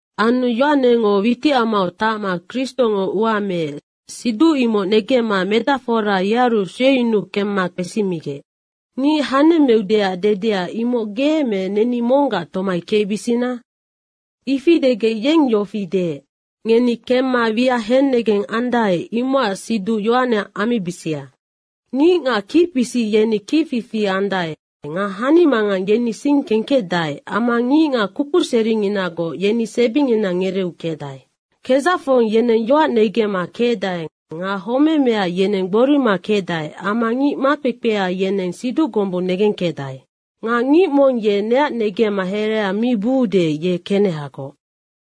Anu Yohanengo witicamau tacma Kristongo ua meec, siduc imoc negemma medacfora yearu sueyunuu kemma kpesimigec, “Ngic hanemmeudeac dedea, imoc ge me neni monggac tomai kecbisina?” Ifi degec yeng yofi deec, “Ngeni kemma wiac hennegeng andae, imocac siduc Yohane ammibisia. Ngicngac kicpisic yeni kicfifi andae nga hanimangang yeni sing kengkecdae amma ngicngac kukuseringinagoc yeni sebingina ngereeu kecdae. Kedzacfong yeneng yoac negemma kecdae nga homemea yeneng gborima kecdae amma ngic makpekpea yeneng siduc gombung negengkecdae. Nga ngic mong ye neac negemma herea mi buude, ye kenehagoc.”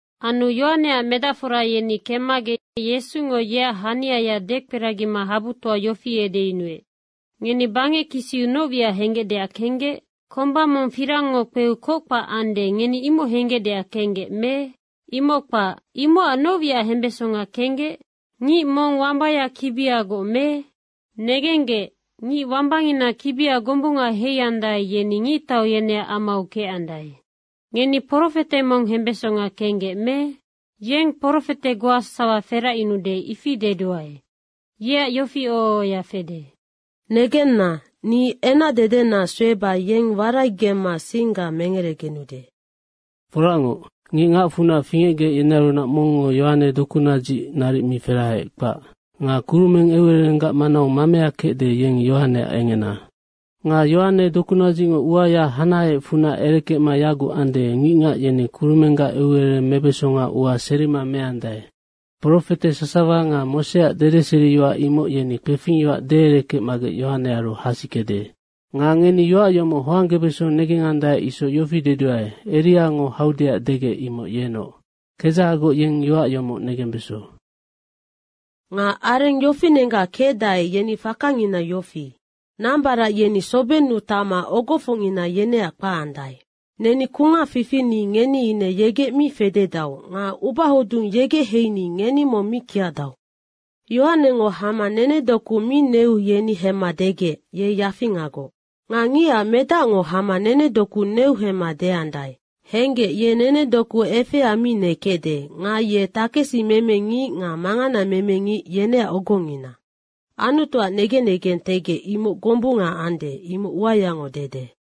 Anu Yohaneac medacfora yeni kemmagec Yesungo yeac haniaya dekperagima habutoa yofi edeyunuec, “Ngeni bangec kisiu noc wiac henggecdeac kenggec? Komba mong firangngo kpeu kockpac ande, ngeni imoc henggecdeac kenggec me? Imoc kpac. Imocac noc wiac hembesonga kenggec? Ngic mong wambaya kibiagoc me? Negenggec, ngic wambangina kibia gombunga heiandae, yeni ngictau yeneac amau kecandae. Ngeni profete mong hembesonga kenggec me? Yennoc profete goa sasawa feracyunude, ifi deduae. Yeacnoc yofi oho ohoya fede, ‘Negenna, ni enacdedena sueba yeng waraigemma singga mengeregenude.’ Foracngoc, ngic ngacfunac fingecgec, yenearunac mongngo Yohane dokunadzic naric mi ferahaec, kpac. Nga kurumeng eucererenggac manau mamea kecde, yeng Yohaneac engena. Nga Yohane dokunadzicngo uaya hanaheecfunac erekecma yaguc ande, ngicngac yeni kurumenggac eucerereng mebesonga ua serima meandae. Profete sasawa nga Moseac dedeseriyoac, imoc yeni kpefingyoac deerekecmagec Yohanearu hasikede. Nga ngeni yoac yomoc hoanggebeso negengandae isoc yofi deduae, Eriango haudeac degec, imoc yenoc. Kedzahagoc yeng yoac yomoc negembeso. Nga areng yofinenggac kecdae, yeni fakangina yofi. Nambarac yeni sobennu tacma ogofocngina yeneac kpacandae, ‘Neni kungac fifini ngeni ine yegec mi fededau nga ubahodung yegec heini ngeni mong mi kiacdau.’ Yohanengo hama nenedoku mi neu yeni hemma degec, ‘Ye yafingagoc.’ Nga Ngicac Medacngo hama nenedoku neu hemma deandae, ‘Henggec, ye nenedoku efea mi nekecde nga ye takesimeme ngic nga manganameme ngic yeneac ogongina.’ Anutuac negen negentegec, imoc gombunga ande, imoc uayango dede.”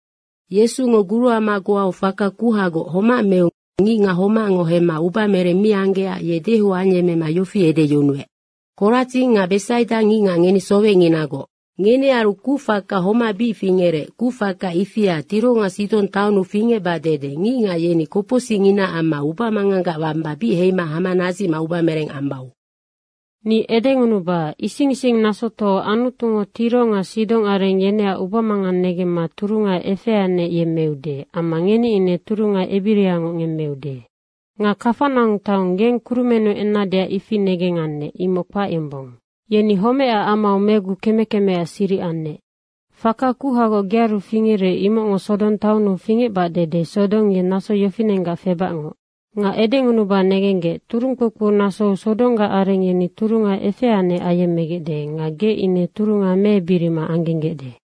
Yesungo guruama goau faka kuhagoc homac meu ngicngac homacngo hemma ubamereng mi anggecac ye dehou ayemmema yofi edeyunuec, “Koradzing nga Besaida ngicngac, ngeni sowecnginagoc. Ngenearu kucfaka homac bic fingerec, kucfaka ifia Tiro nga Sidong taonnu fingecbac dede ngicngac yeni kopocsicnginaac amma ubamanganggac wamba bic heima hama nadzicma ubamereng ambau. Ni edengunuba, ising ising nasotoau Anutungo Tiro nga Sidong areng yeneac ubamangang negemma turunga efeanec yemmeude amma ngeni ine turunga ebiriangoc ngemmeude. Nga Kafanaung taong, geng kurumennu ennadeac ifi negengannec, imoc kpac yombong. Yeni homecac amau megu keme kemeac siric annec. Faka kuhagoc gearu fingerec, imocngo Sodong taonnu fingecbac dede Sodong ye naso yofinenggac febacngoc. Nga edengunuba negenggec, turung kpoukpou nasou Sodonggac areng yeni turunga efeanec ayemmegecde nga ge ine turunga meebirima anggenggecde.”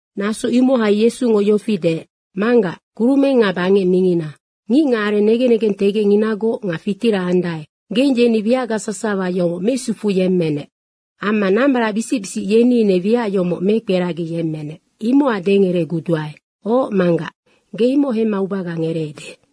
Naso imohai Yesungo yofi deec, “Manggac, kurumeng nga bangec mingina, ngicngacareng negen negentegecnginagoc nga fitira andae, geng yeni wiacga sasawa yomoc mesufuyemmenec. Amma nambaracbisic bisic, yeni ine wiac yomoc mekperagiyemmenec, imocac dengereguduae. Oc Manggac, ge imoc hemma ubaga ngereede.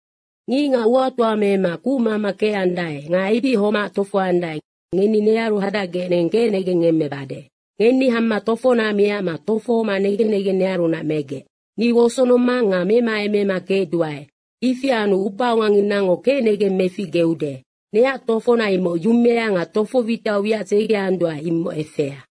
Ngicngac uatoa mema kucmama kecandae nga ebic homac tofohoandae, ngeni nearu hadacgec neng kecnegeng ngemmebade. Ngeni hama tofona miacma tofohoma negen negeng nearunac megec. Ni wosonomang nga memaemema kecduae. Ifi anu ubaonganginango kecnegeng meficgeude. Neac tofona imoc yumea nga tofo witiau wiac dzegeanduae imoc efea.”